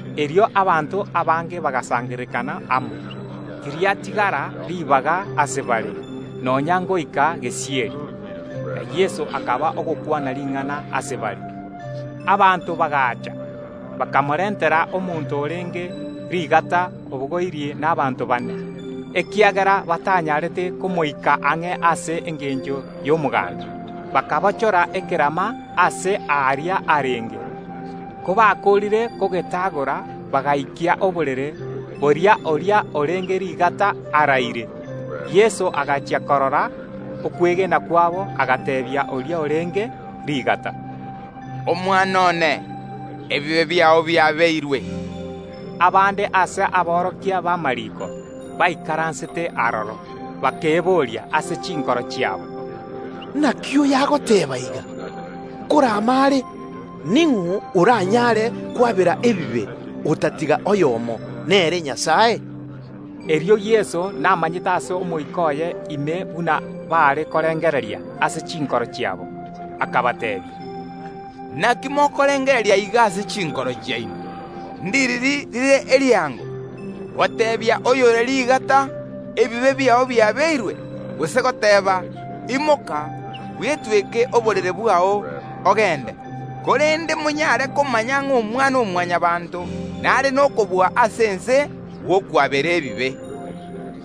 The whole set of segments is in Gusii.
Erio abanto abange bagasangererekana amo, tiriatigara ribaga ase bare, nonya ngoika gesieri; na Yeso akaba ogokwana ring’ana ase bare. Abanto bagaacha; bakamorentera omonto orenge rigata obogoirie nabaanto bane. Ekiagera batanyarete komoikia ang’e ase engencho y’omoganda, bakabochora ekerama aase aaria Yeso arenge. Kobakoorire kogetagora, bagaikia oborere boria oria orenge rigata araire. Yeso agachia korora okwegena kwabo agateebia oria orenge rigata, “Omwana one, ebibe biao biabeirwe.” Abande ase aborokia b’amariiko baikaransete aroro, bakeboria ase chinkoro chiabo, “Inaki oyo agoteeba iga? Nkorama are! Ning’o oranyare kwabera ebibe, otatiga oyomo, nere Nyasae?” Erio Yeso namanyete ase omoika oye ime buna baare korengereria ase chinkoro chiabo, akabateebia, “Inaki mokorengereria iga ase chinkoro chiaino? Ndiriri rire eriango, goteebia oyore rigata: Ebibe biao biabeirwe, gose goteeba: Imoka, bwetweke oborere bwao, ogende? Korende monyare komanya ng’a Omwana-o-Mwanyabaanto nare nokobua ase ense gw’okwabera ebibe.”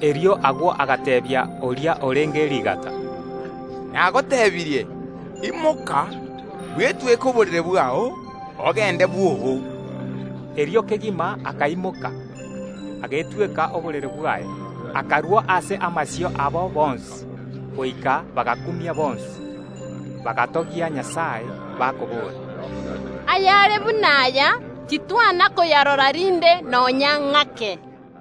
Erio agwo agateebia oria orenge rigata, “Nagotebirie, imoka, bwetweke oborere bwao, ogende bwoo.” Erio kegima akaimoka, agetweka oborere bwaye, akarua ase amasio abo bonsi; goika bagakumia bonsi, bagatogia Nyasae, bakoboora, “Ayare buna aya, titwana koyarora rinde nonya ng’ake!”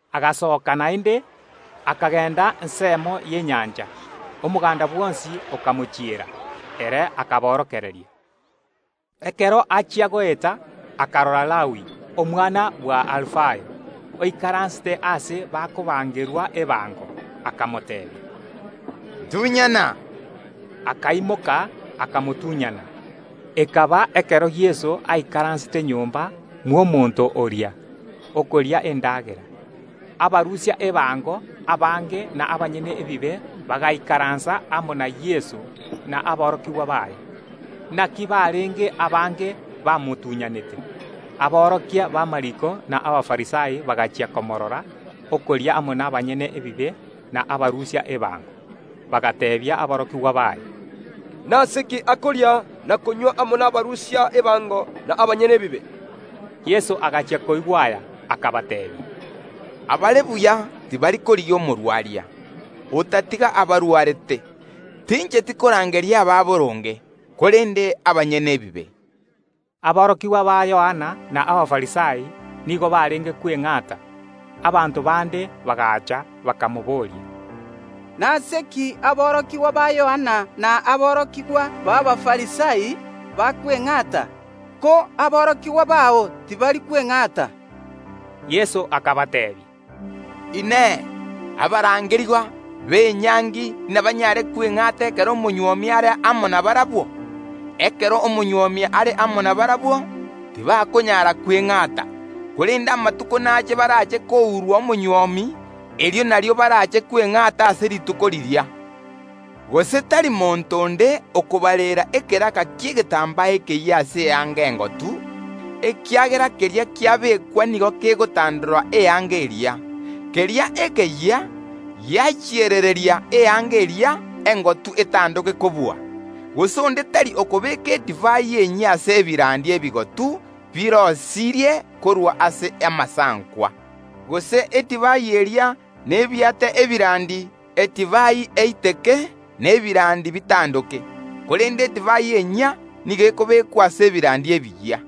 Yeso naende akairana gochia ensemo y’enyancha. Omoganda bwonsi okamochiera, ere agachaaka koborokereria. Ekero achia goeta, akarora Lawi, omwana bw’Alufayo, oikaransete aase bakoruseria ebango, akamoteebia, “Ntunyana!” Akaimoka, akamotunyana. Ekaba ekero Yeso aikaransete nyomba mw’omonto oria, okoria endagera, abarusia ebango abange na abanyene ebibe bagaikaransa amo na Yeso na aborokigwa baye; inaki barenge abange bamotuny’anete. Aborokia b’amariiko na Abafarisai bagachia komoorora okoria amo n’abanyene ebibe na abarusia ebango, bagateebia aborokigwa baye, “Nase ki akoria na konywa amo nabarusia ebango na abanyene ebibe?” Yeso agachia koigwa aya, akabateebia, “Abare buya tibari korigia omogwenia, otatiga abarwarete; tincheti korangeria abanyaboronge, korende abanyene ebibe.” Aborokigwa ba Yohana na Abafarisai nigo barenge kweng’ata. Abanto bande bagaacha, bakamobooria, “Nase ki aborokigwa ba Yohana na aborokigwa b’Abafarisai bakweng’ata, ko aborokigwa bao tibari kweng’ata?” Yeso akabateebia, “Inee! Abatuunyire enyangi inabanyare kweng’ata ekero omonywomi are amo nabarabwo? Ekero omonywomi are amo na barabwo, tibakonyara kweng’ata. Korende amatuko naache baraache kourwa omonywomi, erio nario baraache kweng’ata ase rituko riria. Gose tari monto onde okobareera ekeraka ki’egetambaa ekeyia ase eanga engotu ekiagera keria kiabekwa nigo kegotandora eanga eria, keria ekeyia kiagendereria eanga eria engotu etandoke kobua. Gose onde tari okobeeka edivai enyia ase ebirandi ebigotu biroisirie korwa ase amasankwa, gose edivai eria nebiate ebirandi, edivai eiteke, na ebirandi bitandoke; korende edivai enyia nigo ekobekwa ase ebirandi ebiyia.”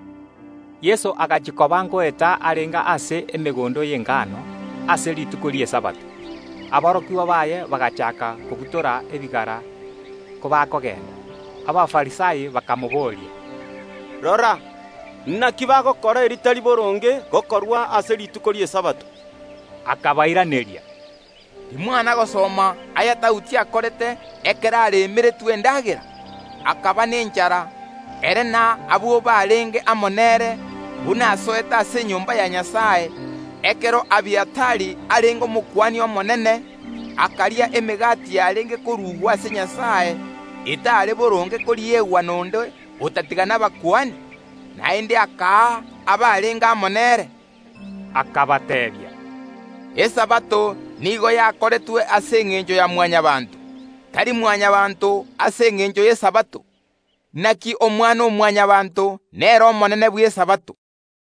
Yeso agachia koba ngoeta arenge ase emegondo y’engano ase rituko ri’Esabato; aborokigwa baye bagachaaka kobutora ebigara kobakogenda. Abafarisai bakamoboria, “Rora, naki bagokora eritari boronge gokorwa ase rituko ri’Esabato?” Akabairaneria, “Timwana gosoma aya Daudi akorete ekero aremeretwe endagera, akaba nenchara, ere na abwo barenge amo nere, buna asoete ase enyomba ya Nyasae, ekero Abiatari arenge Omokuani omonene, akaria emegati yarenge korugwa ase Nyasae, etare boronge koriegwa nonde otatiga abakuani, naende akaa abarenge amo nere?” Akabateebia, “Esabato nigo yakoretwe ase engencho ya Mwanyabaanto, tari Mwanyabaanto ase engencho y’Esabato; naki Omwana-o-Mwanyabaanto nere omonene bw’Esabato.”